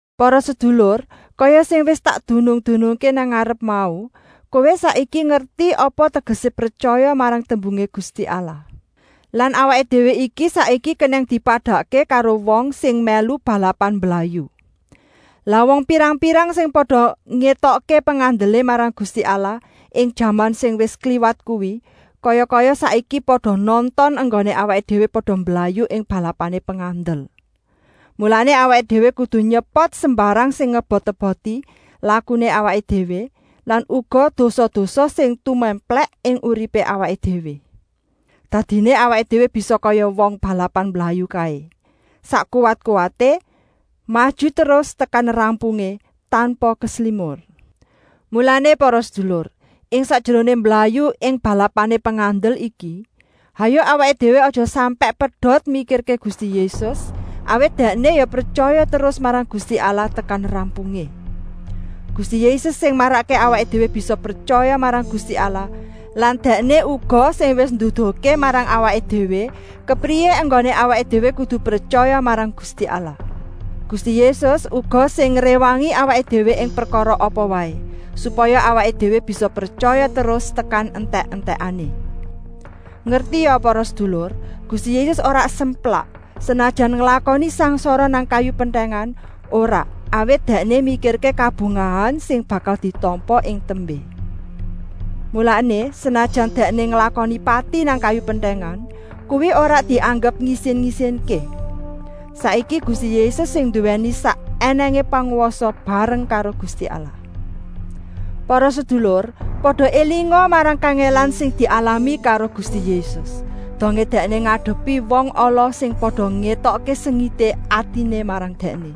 Para sedulur, kaya sing wis tak dunung-dunungké nang ngarep mau, kowé saiki ngerti apa tegesé pretyaya marang tembungé Gusti Allah. Lan awaké déwé iki saiki kenèng dipadakké karo wong sing mèlu balapan mblayu. Lah wong pirang-pirang sing pada ngétokké pengandelé marang Gusti Allah ing jaman sing wis kliwat kuwi kaya-kaya saiki pada nonton enggoné awaké déwé pada mblayu ing balapané pengandel. Mulané awaké déwé kudu nyepot sembarang sing ngebot-eboti lakuné awaké déwé lan uga dosa-dosa sing tumèmplèk ing uripé awaké déwé. Dadiné awaké déwé bisa kaya wong balapan mblayu kaé, sak kuwat-kuwaté maju terus tekan rampungé, tanpa keslimur. Mulané para sedulur, ing sakjeroné mblayu ing balapané pengandel iki, hayuk awaké déwé aja sampèk pedot mikirké Gusti Yésus, awit Dèkné ya pretyaya terus marang Gusti Allah tekan rampungé. Gusti Yésus sing marakké awaké déwé bisa pretyaya marang Gusti Allah lan Dèkné uga sing wis nduduhké marang awaké déwé kepriyé enggoné awaké déwé kudu pretyaya marang Gusti Allah. Gusti Yésus uga sing ngréwangi awaké déwé ing prekara apa waé, supaya awaké déwé bisa pretyaya terus tekan entèk-entèkané. Ngertia para sedulur, Gusti Yésus ora semplak, senajan nglakoni sangsara nang kayu pentèngan, ora, awit Dèkné mikirké kabungahan sing bakal ditampa ing tembé. Mulané, senajan Dèkné nglakoni pati nang kayu pentèngan, kuwi ora dianggep ngisin-isinké. Saiki Gusti Yésus sing nduwèni sak ènèngé pangwasa bareng karo Gusti Allah. Para sedulur, pada élinga marang kangèlan sing dialami karo Gusti Yésus, dongé Dèkné ngadepi wong ala sing pada ngetokké sengité atiné marang Dèkné.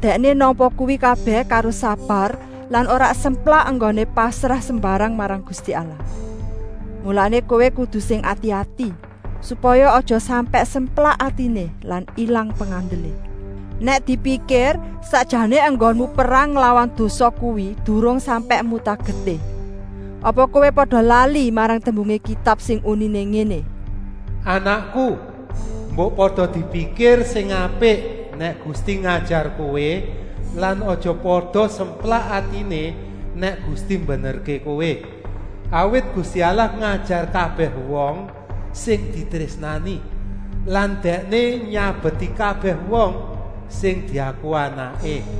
Dèkné nampa kuwi kabèh karo sabar lan ora semplak enggoné pasrah sembarang marang Gusti Allah. Mulané kowé kudu sing ati-ati, supaya aja sampèk semplak atiné lan ilang pengandelé. Nèk dipikir, sakjané enggonmu perang nglawan dosa kuwi durung sampèk mutah getih. Apa kowé pada lali marang tembungé Kitab sing uniné ngéné: “Anakku, mbok pada dipikir sing apik nèk Gusti ngajar kowé lan aja pada semplak atiné nèk Gusti mbenerké kowé. Awit Gusti Allah ngajar kabèh wong sing ditrésnani lan Dèkné nyabeti kabèh wong sing diaku anaké.”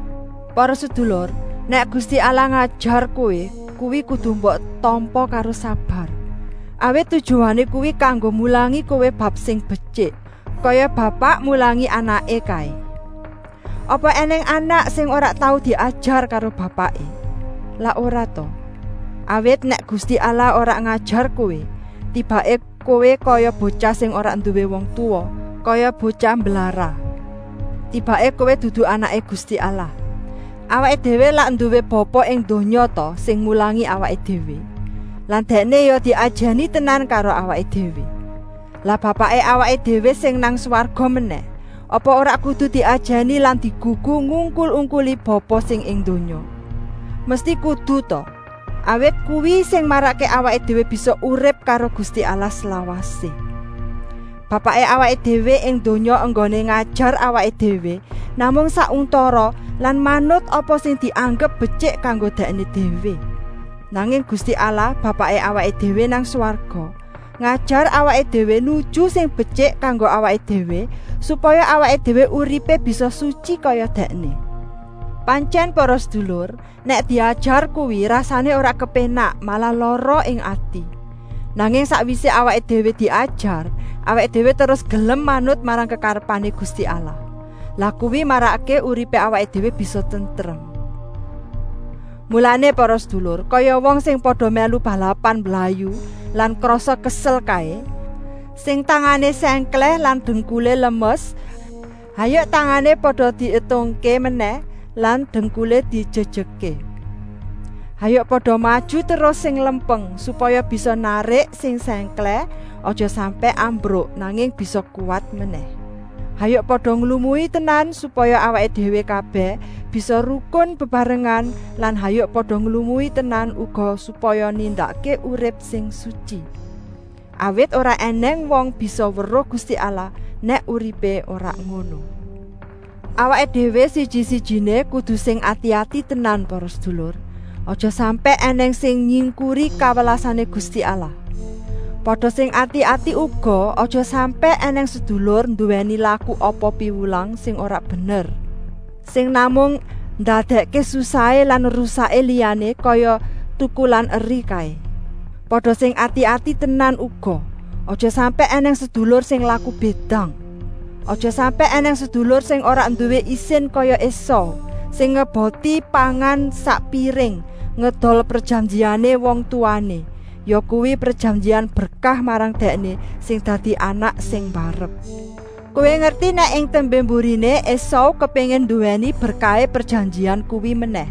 Para sedulur, nèk Gusti Allah ngajar kowé kuwi kudu mbok tampa karo sabar, awit tujuané kuwi kanggo mulangi kowé bab sing betyik, kaya bapak mulangi anaké kaé. Apa ènèng anak sing ora tau diajar karo bapaké? Lak ora ta. Awit nèk Gusti Allah ora ngajar kowé, tibaké kowé kaya botyah sing ora nduwé wong tuwa, kaya botyah mblarah. Tibaké kowé dudu anaké Gusti Allah. Awaké déwé lak nduwé bapa ing donya ta sing mulangi awaké déwé? Lan dèkné ya diajèni tenan karo awaké déwé. Lah bapaké awaké déwé sing nang swarga menèh, apa ora kudu diajèni lan digugu ngungkul-ungkuli bapa sing ing donya? Mesti kudu ta, awit kuwi sing marakké awaké déwé bisa urip karo Gusti Allah slawasé. Bapaké awaké déwé ing donya enggoné ngajar awaké déwé namung sak untara lan manut apa sing dianggep betyik kanggo dèkné déwé. Nanging Gusti Allah, Bapaké awaké déwé nang swarga, ngajar awaké déwé nuju sing betyik kanggo awaké déwé, supaya awaké déwé uripé bisa sutyi kaya Dèkné. Pantyèn para sedulur, nèk diajar kuwi rasané ora kepénak, malah lara ing ati. Nanging sakwisé awaké déwé diajar, awaké déwé terus gelem manut marang kekarepané Gusti Allah. Lah kuwi marakké uripé awaké déwé bisa tentrem. Mulané para sedulur, kaya wong sing pada mèlu balapan mblayu lan krasa kesel kaé, sing tangané sèngklèh lan dengkulé lemes, hayuk tangané pada dietungké menèh lan dengkulé dijejekké. Hayuk pada maju terus sing lempeng, supaya bisa narik sing sèngklèh aja sampèk ambruk, nanging bisa kuwat menèh. Hayuk pada nglumui tenan supaya awaké déwé kabèh bisa rukun bebarengan lan hayuk pada nglumui tenan uga supaya nindakké urip sing sutyi. Awit ora ènèng wong bisa weruh Gusti Allah nèk uripé ora ngono. Awaké déwé siji-sijiné kudu sing ati-ati tenan para sedulur, aja sampèk ènèng sing nyingkuri kawelasané Gusti Allah. Pada sing ati-ati uga, aja sampèk ènèng sedulur nduwèni laku apa piwulang sing ora bener, sing namung ndadèkké susahé lan rusaké liyané, kaya tukulan eri kaé. Pada sing ati-ati tenan uga, aja sampèk ènèng sedulur sing laku bédang. Aja sampèk ènèng sedulur sing ora nduwé isin kaya Esau, sing ngeboti pangan sak piring, ngedol prejanjiané wong tuwané, yakuwi prejanjian berkah marang dèkné sing dadi anak sing mbarep. Kowé ngerti nèk ing tembé-mburiné Esau kepéngin nduwèni berkahé prejanjian kuwi menèh,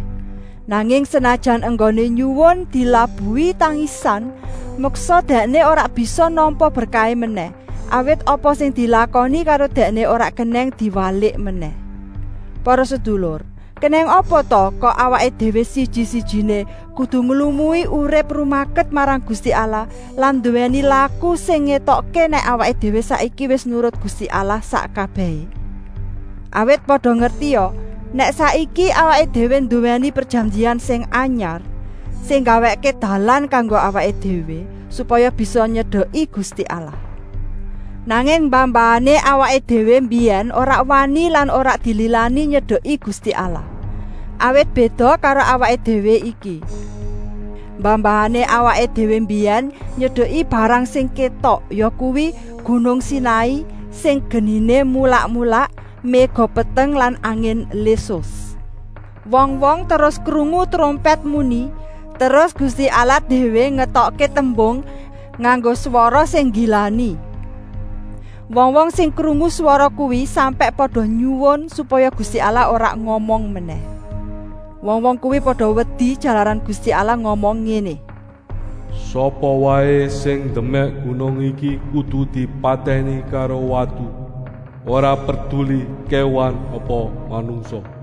nanging senajan enggoné nyuwun dilabuhi tangisan, meksa dèkné ora bisa nampa berkahé menèh, awit apa sing dilakoni karo dèkné ora kenèng diwalik menèh. Para sedulur, kenèng apa ta kok awaké déwé siji-sijiné kudu nglumui urip rumaket marang Gusti Allah lan nduwèni laku sing ngétokké nèk awaké déwé saiki wis nurut Gusti Allah sak kabèhé? Awit pada ngertia nèk saiki awaké déwé nduwèni prejanjian sing anyar, sing nggawèkké dalan kanggo awaké déwé, supaya bisa nyedeki Gusti Allah. Nanging mbah-mbahané awaké déwé mbiyèn ora wani lan ora dililani nyedeki Gusti Allah. Awit béda karo awaké déwé iki, mbah-mbahané awaké déwé mbiyèn nyedeki barang sing kétok, yakuwi gunung Sinai sing geniné mulak-mulak, méga peteng lan angin lésus. Wong-wong terus krungu trompèt muni, terus Gusti Allah déwé ngetokké tembung nganggo swara sing nggilani. Wong-wong sing krungu swara kuwi sampèk pada nyuwun, supaya Gusti Allah ora ngomong menèh. Wong-wong kuwi pada wedi, jalaran Gusti Allah ngomong ngéné: “Sapa waé sing ndemèk gunung iki kudu dipatèni karo watu, ora perduli kéwan apa manungsa.”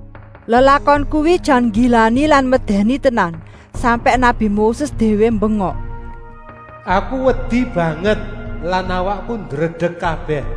Lelakon kuwi jan nggilani lan medèni tenan, sampèk nabi Moses déwé mbengok: “Aku wedi banget lan awakku ndredek kabèh.”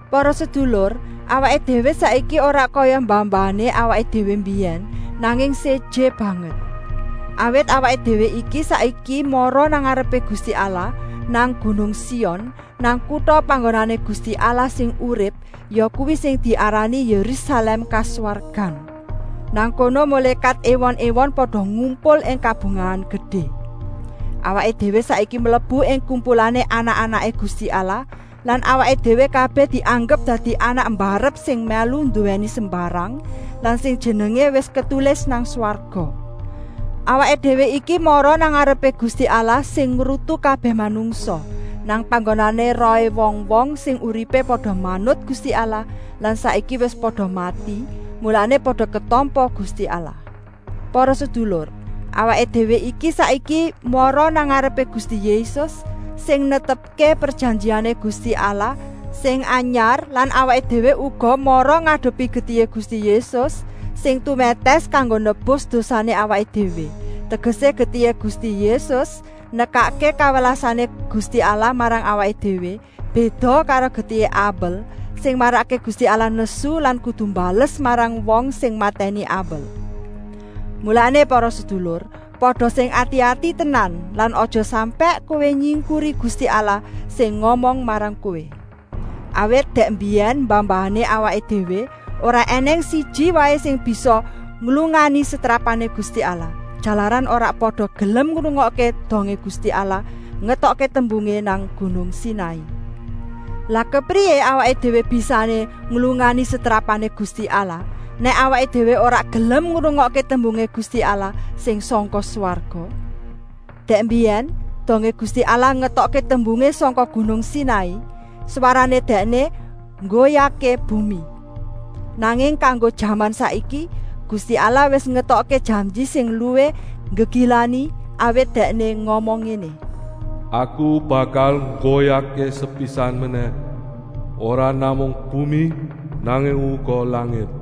Para sedulur, awaké déwé saiki ora kaya mbah-mbahané awaké déwé mbiyèn, nanging séjé banget. Awit awaké déwé iki saiki mara nang ngarepé Gusti Allah nang gunung Sion, nang kuta panggonané Gusti Allah sing urip, yakuwi sing diarani Yérusalèm kaswargan. Nang kono mulékat èwon-èwon pada ngumpul ing kabungahan gedé. Awaké déwé saiki mlebu ing kumpulané anak-anaké Gusti Allah lan awaké déwé kabèh dianggep dadi anak mbarep sing mèlu nduwèni sembarang lan sing jenengé wis ketulis nang swarga. Awaké déwé iki mara nang ngarepé Gusti Allah sing ngrutu kabèh manungsa, nang panggonané rohé wong-wong sing uripé pada manut Gusti Allah lan saiki wis pada mati, mulané pada ketampa Gusti Allah. Para sedulur, awaké déwé iki saiki mara nang ngarepé Gusti Yésus sing netepké prejanjiané Gusti Allah sing anyar lan awaké déwé uga mara ngadepi getihé Gusti Yésus sing tumètès kanggo nebus dosané awaké déwé, tegesé getihé Gusti Yésus nekakké kawelasané Gusti Allah marang awaké déwé, béda karo getihé Abel, sing marakké Gusti Allah nesu lan kudu mbales marang wong sing matèni Abel. Mulané para sedulur, pada sing ati-ati tenan lan aja sampèk kowé nyingkuri Gusti Allah sing ngomong marang kowé. Awit dèk mbiyèn mbah-mbahané awaké déwé ora ènèng siji waé sing bisa nglungani setrapané Gusti Allah, jalaran ora pada gelem ngrungokké dongé Gusti Allah ngetokké tembungé nang gunung Sinai. Lah kepriyé awaké déwé bisané nglungani setrapané Gusti Allah, nèk awaké déwé ora gelem ngrungokké tembungé Gusti Allah sing sangka swarga? Dèk mbiyèn, dongé Gusti Allah ngetokké tembungé sangka gunung Sinai, swarané Dèkné ngoyakké bumi. Nanging kanggo jaman saiki Gusti Allah wis ngetokké janji sing luwih nggilani, awit Dèkné ngomong ngéné: “Aku bakal ngoyakké sepisan menèh, ora namung bumi, nanging uga langit.”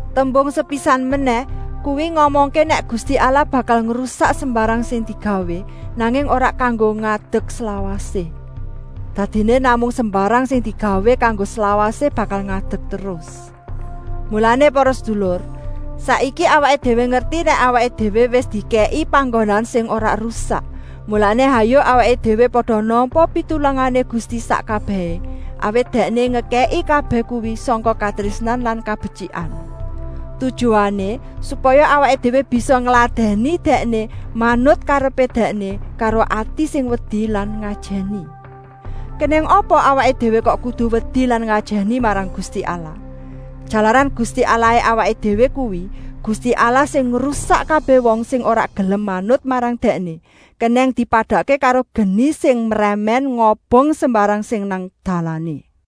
Tembung “sepisan menèh” kuwi ngomongké nèk Gusti Allah bakal ngrusak sembarang sing digawé, nanging ora kanggo ngadek slawasé. Dadiné namung sembarang sing digawé kanggo slawasé bakal ngadek terus. Mulané para sedulur, saiki awaké déwé ngerti nèk awaké déwé wis dikèki panggonan sing ora rusak, mulané hayuk awaké déwé pada nampa pitulungané Gusti sak kabèhé, awit Dèkné ngekèki kabèh kuwi sangka katrésnan lan kabetyikan. Tujuané, supaya awaké déwé bisa ngladèni Dèkné manut karepé Dèkné, karo ati sing wedi lan ngajèni. Kenèng apa awaké déwé kok kudu wedi lan ngajèni marang Gusti Allah? Jalaran Gusti Allahé awaké déwé kuwi Gusti Allah sing ngrusak kabèh wong sing ora gelem manut marang Dèkné, kenèng dipadakké karo geni sing mrèmèn ngobong sembarang sing nang dalané.